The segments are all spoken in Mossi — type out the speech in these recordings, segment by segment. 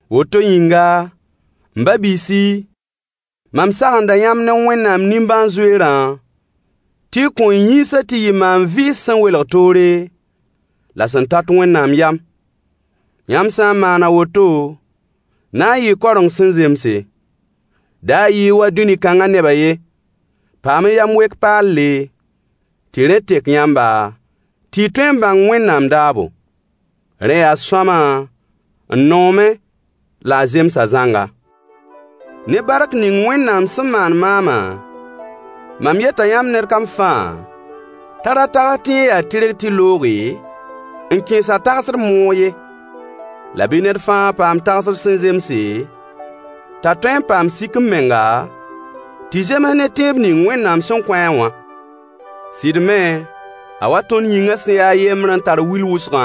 Woto yĩnga, m ba-biisi, mam sagenda yãmb ne Wẽnnaam nimbãan-zoeerã tɩ y kõ y yĩnsã tɩ yɩ maan-vɩɩs sẽn welg toore, la sẽn tat Wẽnnaam yam. Yãmb sã n maan a woto, na n yɩɩ kaoreng sẽn zemse. Da yɩ-y wa dũni kãngã nebã ye. Paam-y yam-wek-paalle, tɩ rẽ tek yãmba, tɩ y tõe n bãng Wẽnnaam daabo: Rẽ yaa sõama, n noomẽ la a zemsa zãnga. Ne bark ning Wẽnnaam sẽn maan maamã, mam yeta yãmb ned kam fãa t'a ra tags tɩ yẽ yaa tɩrg tɩ looge, n kẽes a tagsd moog ye. La bɩ ned fãa paam tagsd sẽn zemse, t'a tõe n paam sik-m-menga, tɩ zems ne tẽeb ning Wẽnnaam sẽn kõ-a wã. Sɩd me, a wa tõnd yĩngã sẽn ya a yembr n tar wil wʋsgã,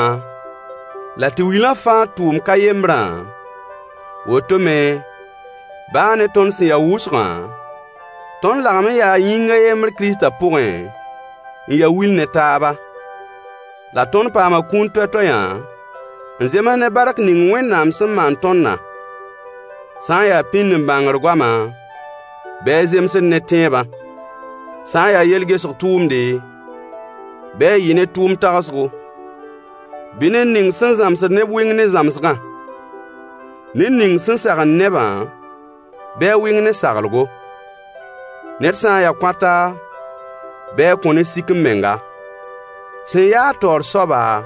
la tɩ wilã fãa tʋʋm ka yembrã, woto me, baa ne tõnd sẽn ya wʋsgã, tõnd lagem n yaa yĩng a yembr Kiristã pʋgẽ, n ya wil ne taaba. La tõnd paama kũun toay-toayã, n zems ne bark ning Wẽnnaam sẽn maan tõndã: Sã n yaa pĩnd-n-bãngr goama, bɩ a zemsd ne tẽebã. Sã n yaa yel-gesg tʋʋmde, bɩ a yɩ ne tʋʋmd tagsgo. Bɩ ned ning sẽn zãmsd neb wɩng ne zãmsgã. Ned ning sẽn sagend nebã, bɩ a wɩng ne saglgo. Ned sã n ya kõata, bɩ a kõ ne sik-m-menga. Sẽn yaa-a taoor soaba,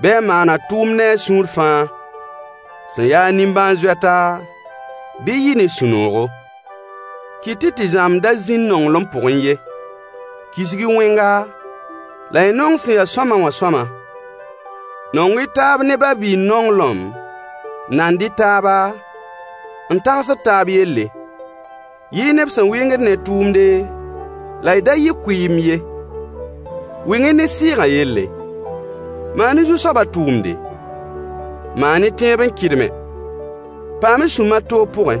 bɩ a maan a tʋʋmd ne a sũur fãa. Sẽn yaa-a nimbãan-zoɛta, bɩ yɩ ne sũ-noogo. Kɩt-y tɩ zãmb da zĩnd nonglem pʋgẽ ye. Kisg-y wẽnga, la y nong sẽn ya sõama wã sõama. Nong-y taab ne babiir nonglem. Nand-y taaba, n tagsd taab yelle. Yɩ-y neb sẽn wɩngd ne tʋʋmde, la y da yɩ kʋɩɩmb ye. Wɩng-y ne sɩɩgã yelle. Maan-y Zu-soabã tʋʋmde. Maan-y tẽeb n kɩdme. Paam-y sũ-mar toog pʋgẽ.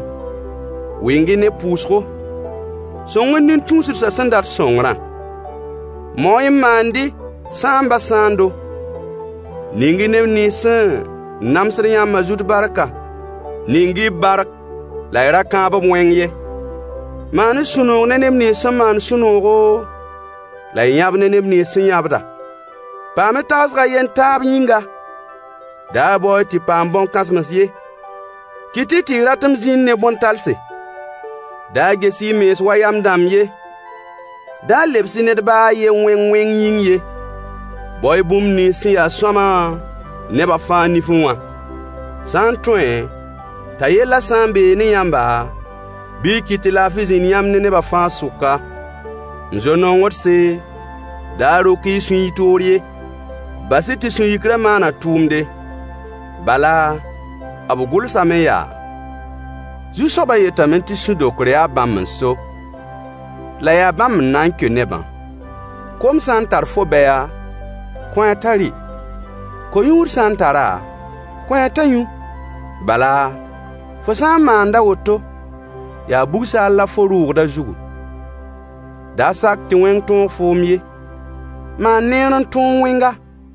Wɩng-y ne pʋʋsgo. Sõng-y nin-tũusdsã sẽn dat sõngrã. Mao-y n maand-y sãambã sãando. Ning-y neb nins sẽn namsd yãmbã zut barka. Ning-y bark la y ra kãab-b wẽng ye. Maan-y sũ-noog ne neb nins sẽn maand sũ-noogo, la y yãb ne neb nins sẽn yãbda. Paam-y tagsg a yen taab yĩnga. Da bao-y tɩ paam bõn-kãsems ye. Kɩt-y tɩ y ratem zĩnd ne bõn-talse. Da ges-y y mens wa yam dãmb ye. Da lebs-y ned baa a ye wẽng wẽng yĩng ye. Bao-y bũmb nins sẽn ya sõama nebã fãa nifẽ wã. Sã n tõe, t'a yellã sã n bee ne yãmba, bɩ y kɩt tɩ laafɩ zĩnd yãmb ne neba fãa sʋka. M zo-nongdse, da rok-y y sũy y toor ye. Bas-y tɩ sũ-yikrã maan a tʋʋmde. Bala, b gʋlsame yaa: Zu-soabã yetame tɩ sũ-dokr yaa bãmb n so, la yaa bãmb n na n keo nebã. Kom sã n tar fo bɛya, kõ-a t'a rɩ. Ko-yũud sã n tar-a, kõ-a t'a yũ. Bala, fo sã n maand a woto, yaa bug-saal la fo rʋʋgd a zugu. Da sak tɩ wẽng tõog foom ye. Maan neer n tõog wẽnga.